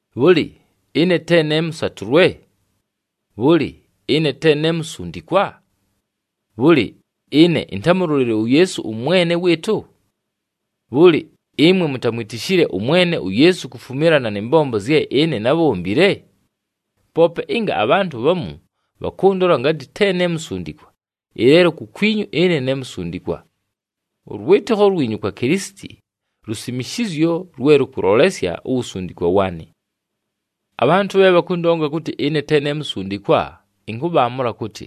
Bhʉlɨ, ɨne te ne mʉsatʉlwe? Bhʉlɨ, ɨne te ne musundikwa? Bhʉlɨ, ɨne intámulolile uYeesu ʉMwene wɨɨtʉ? Bhʉlɨ, ɨmwe mutamwitishile ʉMwene uYeesu kufumilana nɨ mbombo zye ɨne nábhombile? Poope ɨnga abhantʉ bhamu bhakʉndola ngatɨ te ne musundikwa, ɨleelo kukwinyu ɨne ne musundikwa. Ʉlwɨtɨkho lwinyu kwa Kilisiti, lusimishizyo lwe lʉkʉlolesya uwusundikwa waanɨ. Abhantʉ bhe bhakʉndonga kʉtɨ te ne musundikwa, ɨnkʉbhaamʉla kʉtɨ: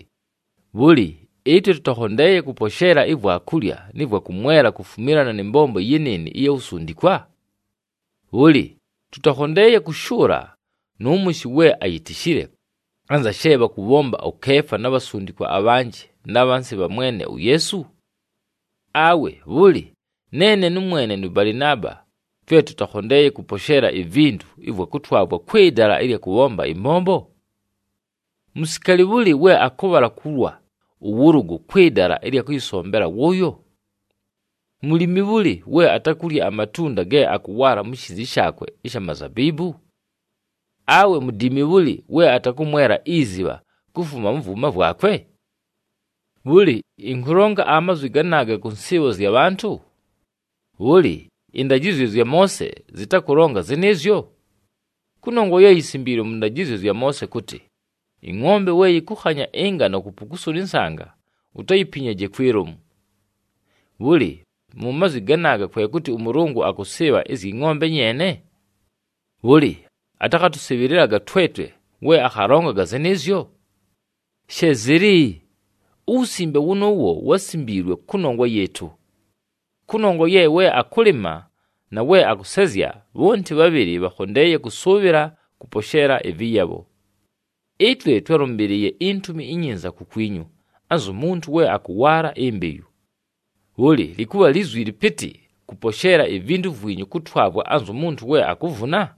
bhʉlɨ, ɨtwe tʉtakhondeeye kʉposheela ivwakulya nɨ vwakʉmwela kufumilana nɨ mbombo yɨnɨɨnɨ ɨya wusundikwa? Bhʉlɨ, tʉtakhondeeye kʉshʉʉla nʉ mʉshɨ we ayitishile, anza she bhakʉbhomba ʉKeefa na bhasundikwa abhanjɨ, na bhansi bha Mwene uYeesu? Awe bhʉlɨ, neene nʉmwene nʉ Balɨnaaba twe tʉtakhondeeye kʉposheela ivintu ɨvwa kʉtwavwa kwɨ dala ɨlya kʉbhomba ɨmbombo? Musikaali bhʉlɨ we akʉbhala kulwa ʉwʉlʉgʉ kwɨ dala ɨlya kʉyɨsombela wʉʉyo? Mulimi bhʉlɨ we atakulya amatunda ge akʉwaala mu shiizi shaakwe ɨsha mazabiibu? Awe mudiimi bhʉlɨ we atakʉmwela izibha kufuma mʉ vwʉma vwakwe? Bhʉlɨ, ɨnkʉlonga amazwi ganaaga kʉ nsɨɨbho zya bhantʉ? Bhʉlɨ, ɨndajɨzyo zya Moose zɨtakʉlonga zɨnɨɨzyo? Kʉnongwa ye yisimbiilwe mʉ ndajɨzyo zya Moose kʉtɨ, “Ɨngʼombe we yɨkʉkhanya ɨngano kupukusula ɨnsanga, utayipinyaje kwi lomu.”Bhʉlɨ, mu mazwi ganaaga kwe kʉtɨ ʉMʉlʉngʉ akʉsɨɨbha ɨzyɨ ngʼombe nyeene? Bhʉlɨ, atakhatʉsɨbhɨlɨlaga twetwe we akhalongaga zɨnɨɨzyo? She zɨlɨ! Uwusimbe wʉnʉʉwo wásimbiilwe kʉnongwa yɨɨtʉ! Kʉnongwa ye we akʉlɨma, na we akʉsezya, bhonti bhabhɨlɨ bhakhondeeye kʉsʉʉbhɨla kʉposheela ɨvɨyabho. Ɨtwe twálʉmbɨlɨɨye iNtumi iNyinza kukwinyu, anzu muntu we akʉwaala imbeyu. Bhʉlɨ, lɨkʉbha lizwi lɨpɨtɨ kʉposheela ivintu vwinyu kʉtwavwa anzu muntu we akuvuna?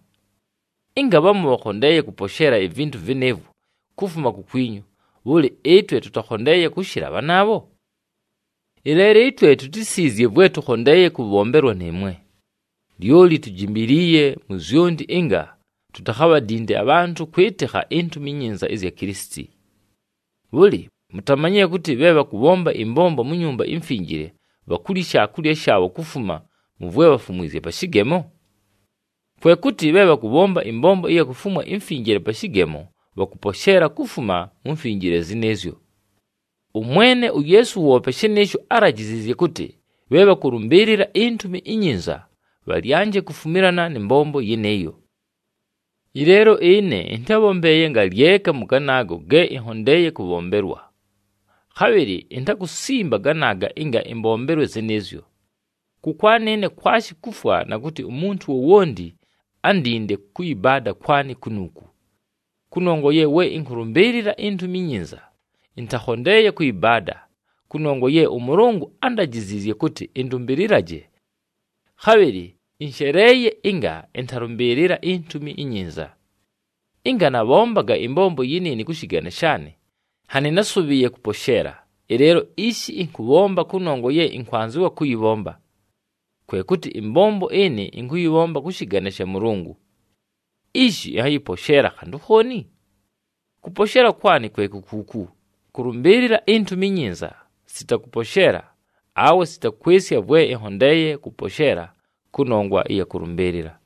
Ɨnga bhamu bhakhondeeye kʉposheela ivintu vɨnɨɨvwo kufuma kukwinyu, bhʉlɨ, ɨtwe tʉtakhondeeye kʉshɨla bhanaabho? Ɨleelo ɨtwe tutísiizye vwe tʉkhondeeye kʉbhombelwa nɨɨmwe, lyoli tujimbiliiye mu zyonti ɨnga tutakhabhadinde abhantʉ kwɨtɨkha iNtumi iNyinza ɨzya Kilisiti. Bhʉlɨ, mutamanyile kʉtɨ bhe bhakʉbhomba ɨmbombo mu Nyumba iMfinjile, bhakulya ishaakulya shaabho kufuma mʉ vwe bhafumwizye pa shɨgemo? Kwe kʉtɨ bhe bhakʉbhomba ɨmbombo ɨya kufumwa imfinjile pa shɨgemo, bhakʉposheela kufuma mu mfinjile zɨnɨɨzyo. ɄMwene uYeesu woope shɨnɨɨsho álajiziizye kʉtɨ bhe bhakʉlʉmbɨɨlɨla iNtumi iNyinza, bhalyanje kufumilana nɨ mbombo yɨnɨɨyo. Ɨleelo ɨne, ɨntábhombeeye ngalyeka mʉ ganaago ge ɨnhondeeye kʉbhombelwa. Khabhɨlɨ intakusimba ganaaga ɨnga ɨmbombelwe zɨnɨɨzyo. Kʉkwanɨ ɨne kwashi kufwa na kʉtɨ umuntu wowonti andinde kʉyɨbaada kwanɨ kunuuku. Kʉnongwa ye we ɨnkʉlʉmbɨɨlɨla iNtumi iNyinza, ɨntakhondeeye kʉyɨbaada, kʉnongwa ye ʉMʉlʉngʉ ándajiziizye kʉtɨ ɨndʉmbɨlɨlaje. Khabhɨlɨ ɨnsheleeye ɨnga ɨntalʉmbɨɨlɨla iNtumi iNyinza! Ɨnga nabhombaga ɨmbombo yɨnɨɨnɨ kʉ shɨgane shaanɨ, nhanɨ násʉbhɨɨye kʉposheela, ɨleelo ishi ɨnkʉbhomba kʉnongwa ye ɨnkwanzɨwa kʉyɨbhomba. Kwe kʉtɨ ɨmbombo ɨnɨ ɨnkʉyɨbhomba kʉ shɨgane sha Mʉlʉngʉ. Ishi ɨnhayɨposheela khantʉ khooni? Kʉposheela kwanɨ kwe ku kuuku: kʉlʉmbɨɨlɨla iNtumi iNyinza sita kʉposheela, awe sita kwɨsya vwe ɨnhondeeye kʉposheela kʉnongwa ɨya kʉlʉmbɨɨlɨla.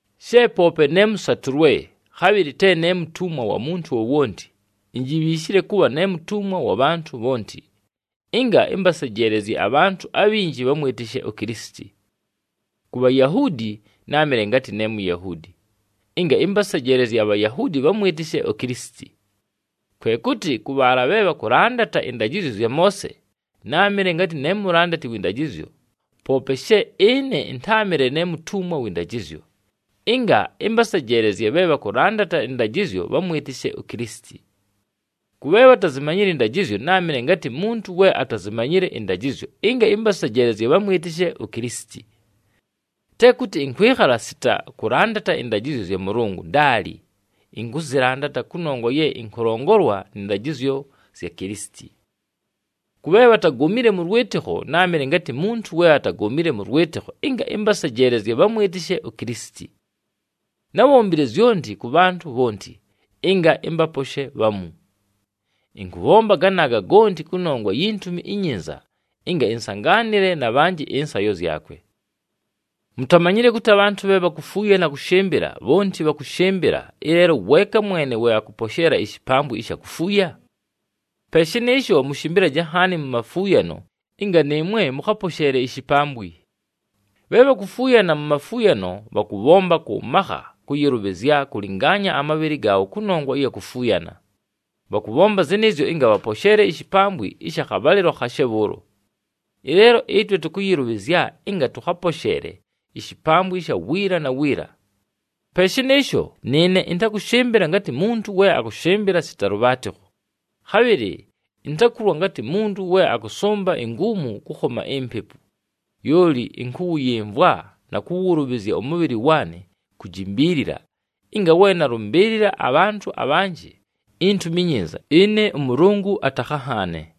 She poope ne mʉsatʉlwe, khabhɨlɨ te ne mutumwa wa muntu wowonti, injibhiishile kʉbha ne mutumwa wa bhantʉ bhonti, ɨnga ɨmbasejeelezye abhantʉ abhinji bhamwɨtɨshe uKilisiti. Ku Bhayahuudi, náamɨle ngatɨ ne Muyahuudi, ɨnga ɨmbasejeelezye aBhayahuudi bhamwɨtɨshe uKilisiti. Kwe kʉtɨ kʉ bhaala bhe bhakʉlandata ɨndajɨzyo zya Moose, náamɨle ngatɨ ne mulandati wɨ ndajɨzyo, poope she ɨne ɨntáamɨle ne mutumwa wɨ ndajɨzyo, ɨnga ɨmbasejeelezye bhe bhakʉlandata ɨndajɨzyo bhamwɨtɨshe uKilisiti. Kʉ bhe bhatazimanyile ɨndajɨzyo, náamɨle ngatɨ muntu we atazimanyile ɨndajɨzyo ɨnga ɨmbasejeelezye bhamwɨtɨshe uKilisiti. Te kʉtɨ ɨnkwɨkhala sita kʉlandata ɨndajɨzyo zya Mʉlʉngʉ, ndaali, ɨnkʉzɨlandata kʉnongwa ye ɨnkʉlongolwa nɨ ndajɨzyo zya Kilisiti. Kʉ bhe bhatagomile mʉ lwɨtɨkho, náamɨle ngatɨ muntu we atagomile mʉ lwɨtɨkho, ɨnga ɨmbasejeelezye bhamwɨtɨshe uKilisiti. Nábhombile zyonti kʉ bhantʉ bhonti, ɨnga ɨmbaposhe bhamu. Ɨnkʉbhomba ganaaga gonti kʉnongwa yi Ntumi iNyinza ɨnga ɨnsangaanɨle na bhanjɨ ɨnsayo zyakwe. Mutamanyile kʉtɨ abhantʉ bhe bhakufuuyana kʉshɨmbɨla, bhonti bhakʉshɨmbɨla, ɨleelo weeka mwene we akʉposheela ishipambwi ɨsha kufuuya? Pe shɨnɨɨsho mʉshɨmbɨlaje nhaani mu mafuuyano ɨnga nɨɨmwe mʉkhaposheele ishipambwi. Bhe bhakufuuyana mu mafuuyano, bhakʉbhomba kʉ makha kʉyɨlʉbhɨzya kʉlɨngaanya amabhɨlɨ gaabho kʉnongwa ɨya kufuuyana. Bhakʉbhomba zɨnɨɨzyo ɨnga bhaposheele ishipambwi ɨsha khabhalɨlo khashe bhʉʉlo. Ɨleelo ɨtwe tʉkʉyɨlʉbhɨzya ɨnga tʉkhaposheele ishipambwi ɨsha wiila na wiila. Pe shɨnɨɨsho, nɨɨne ɨntakʉshɨmbɨla ngatɨ muntu we akʉshɨmbɨla sita lʉbhaatɨkho, khabhɨlɨ intakulwa ngatɨ muntu we akʉsʉmba inguumu kʉkhoma impepu. Lyoli ɨnkʉwʉyɨmvwa na kʉwʉlʉbhɨzya ʉmʉbhɨlɨ waanɨ kujimbiilila ɨnga we nalʉmbɨɨlɨla abhantʉ abhanjɨ iNtumi iNyinza, ɨne ʉMʉlʉngʉ atakhanhaane.